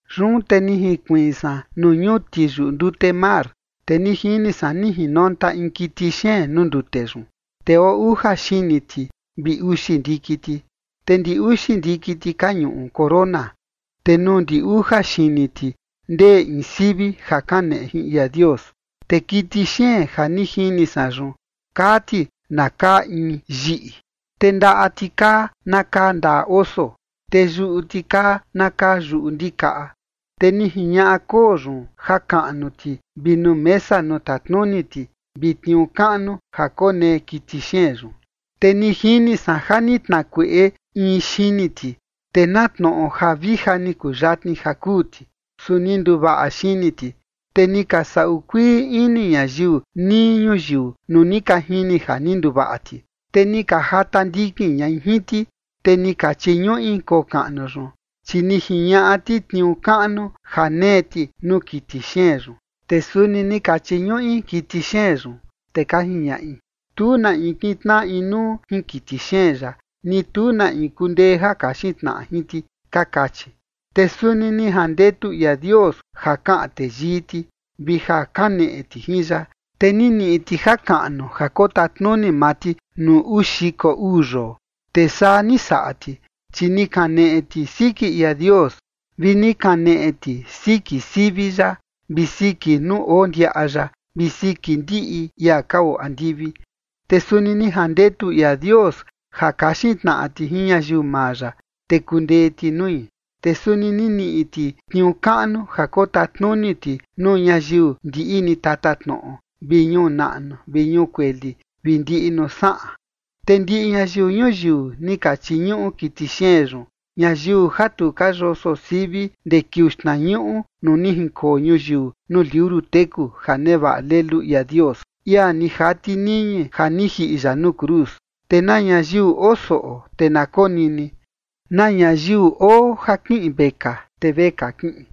Yun te ni jinkuiin san nuu ñuti yuꞌu ndute mar. Te ni jini san ni jinonta in kiti xeen nuu ndute yun, te oo uja xini ti vi uxi ndiki ti, te ndi uxi ndiki ti ka ñuꞌu corona, te nuu ndi uja xini ti ndee in sivi ja kaneꞌe jin ia Dios. Te kiti xeen ja ni jini san yun kaa ti na kaa in yiꞌi, te ndaꞌa ti kaa na kaa ndaꞌa oso, te yuꞌu ti kaa na kaa yuꞌu ndikaꞌa. Te ni jiñaꞌa koo yun jakaꞌnu ti vi nuu mesa nuu tatnuni ti vi tniuu kaꞌnu ja konee kiti xeen yun. Te ni jini san ja ni tnakueꞌe in xini ti, te na tnoꞌo ja vija ni kuyatni ja kuu ti, su ni nduvaꞌa xini ti. Te ni ka saꞌu kuii ini ñayiu nii ñuyiu nuu ni ka jini ja ni nduvaꞌa ti, te ni ka jata ndikin ñai jin ti. Te ni ka chiñuꞌi koo kaꞌnu yun, chi ni jiñaꞌa ti tniuu kaꞌnu ja nee ti nuu kiti xeen yun, te suni ni ka chiñuꞌi kiti xeen yun, te ka jiñaꞌi: ―Tu na in kintnaꞌa inuu jin kiti xeen yaꞌa, ni tu na in kundee ja kaxin tnaꞌa jin ti ―ka kachi. Te suni ni jandetu ia Dios ja kaꞌan teyii ti, vi ja kaneꞌe ti jin ya. Te ni niꞌi ti jakaꞌnu ja kotatnuni maa ti nuu uu xiko uu yoo. Te saa ni saꞌa ti, chi ni kaneꞌe ti siki ia Dios, vi ni kaneꞌe ti siki sivi ya, vi siki nuu oo ndiaꞌa ya, vi siki ndiꞌi ia ka oo andivi. Te suni ni jandetu ia Dios ja kaxin tnaꞌa ti jin ñayiu maa ya, te kundee ti nui. Te suni ni niꞌi ti tniuu kaꞌnu ja kotatnuni ti nuu ñayiu ndiꞌi ni tatatnoꞌo vi ñuu naꞌnu vi ñuu kueli vi ndiꞌi nuu saꞌan. Te ndiꞌi ñayiu ñuyiu ni ka chiñuꞌu kiti xeen yun, ñayiu ja tu ka yoso sivi ndee kiuu xtnañuꞌu nuu ni jinkoo ñuyiu nuu liuru teku ja nevaꞌa Lelu ia Dios, ia ni jati niñi ja ni jiꞌi ya nuu cruz. Te na ñayiu oo soꞌo, te na konini. Na ñayiu oo ja kiꞌin vekaa te vekaa kiꞌin.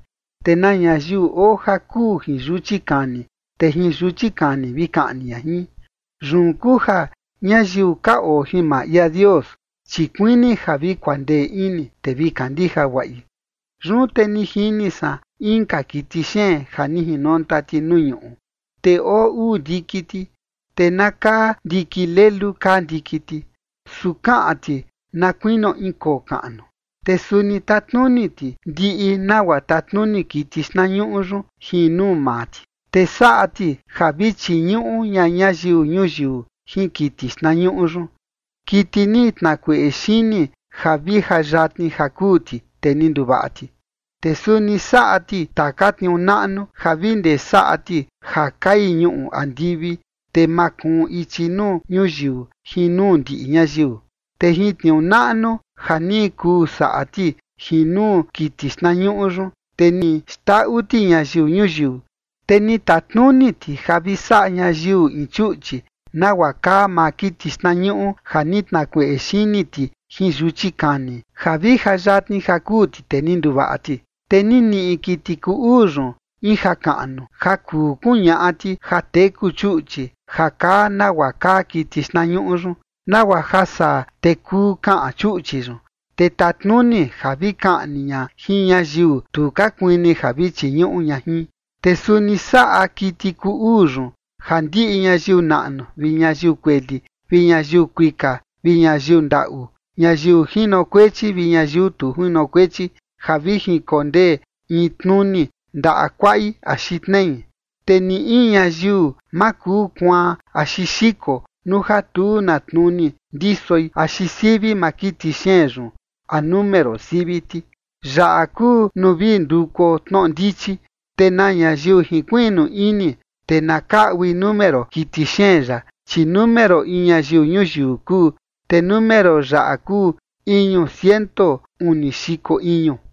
Te na ñayiu oo ja kuu jin yuchi kani, te jin yuchi kani vi kaꞌni ña jin. Yun kuu ja ñayiu ka oo jin maa ia Dios, chi kuini ja vi kuandee ini, te vi kandija guaꞌi. Yun te ni jini san inka kiti xeen ja ni jinonta ti nuu ñuꞌu. Te oo uu ndiki ti, te na kaa ndiki lelu kaa ndiki ti, su kaꞌan ti na kuinio in koo kaꞌnu. Te suni tatnuni ti ndiꞌi nagua tatnuni kiti xtnañuꞌu yun jin nuu maa ti. Te saꞌa ti ja vi chiñuꞌu ña ñayiu ñuyiu jin kiti xtnañuꞌu yun, kiti ni tnakueꞌe xini ja vi ja yatni ja kuu ti, te ni nduvaꞌa ti. Te suni saꞌa ti taka tniuu naꞌnu ja vi ndee saꞌa ti ja kai ñuꞌu andivi, te makuun ichi nuu ñuyiu jin nuu ndiꞌi ñayiu. Te jin tniuu naꞌnu ja ni kuu saꞌa ti jin nuu kiti xtnañuꞌu yun, te ni xndaꞌu ti ñayiu ñuyiu. Te ni tatnuni ti ja vi saꞌa ñayiu in chuꞌchi, nagua kaa maa kiti xtnañuꞌu ja ni tnakueꞌe xini ti jin yuchi kani, ja vi ja yatni ja kuu ti, te ni nduvaꞌa ti. Te ni niꞌi kiti kuu uu yun in jakaꞌnu ja kuu kuñaꞌa ti ja teku chuꞌchi ja kaa nagua kaa kiti xtnañuꞌu yun, nagua ja saa, te kuu kaꞌan chuꞌchi yun, te tatnuni ja vi kaꞌni ña jin ñayiu tu ka kuini ja vi chiñuꞌu ña jin. Te suni saꞌa kiti kuu uu yun ja ndiꞌi ñayiu naꞌnu vi ñayiu kueli, vi ñayiu kuika vi ñayiu ndaꞌu, ñayiu jinokuechi vi ñayiu tu jinokuechi, ja vi jinkondee in tnuni ndaꞌa kuaꞌi axi tnei. Te ni in ñayiu ma kuu kuaan axi xiko nuu ja tu na tnuni ndisoi axi sivi maa kiti xeen yun a número sivi ti. Yaꞌa kuu nuu vi ndukuo tnoꞌo ndichi, te na ñayiu jinkuiꞌnu ini, te na kaꞌui número kiti xeen yaꞌa, chi número in ñayiu ñuyiu kuu. Te número yaꞌa kuu iñu ciento uni xiko iñu.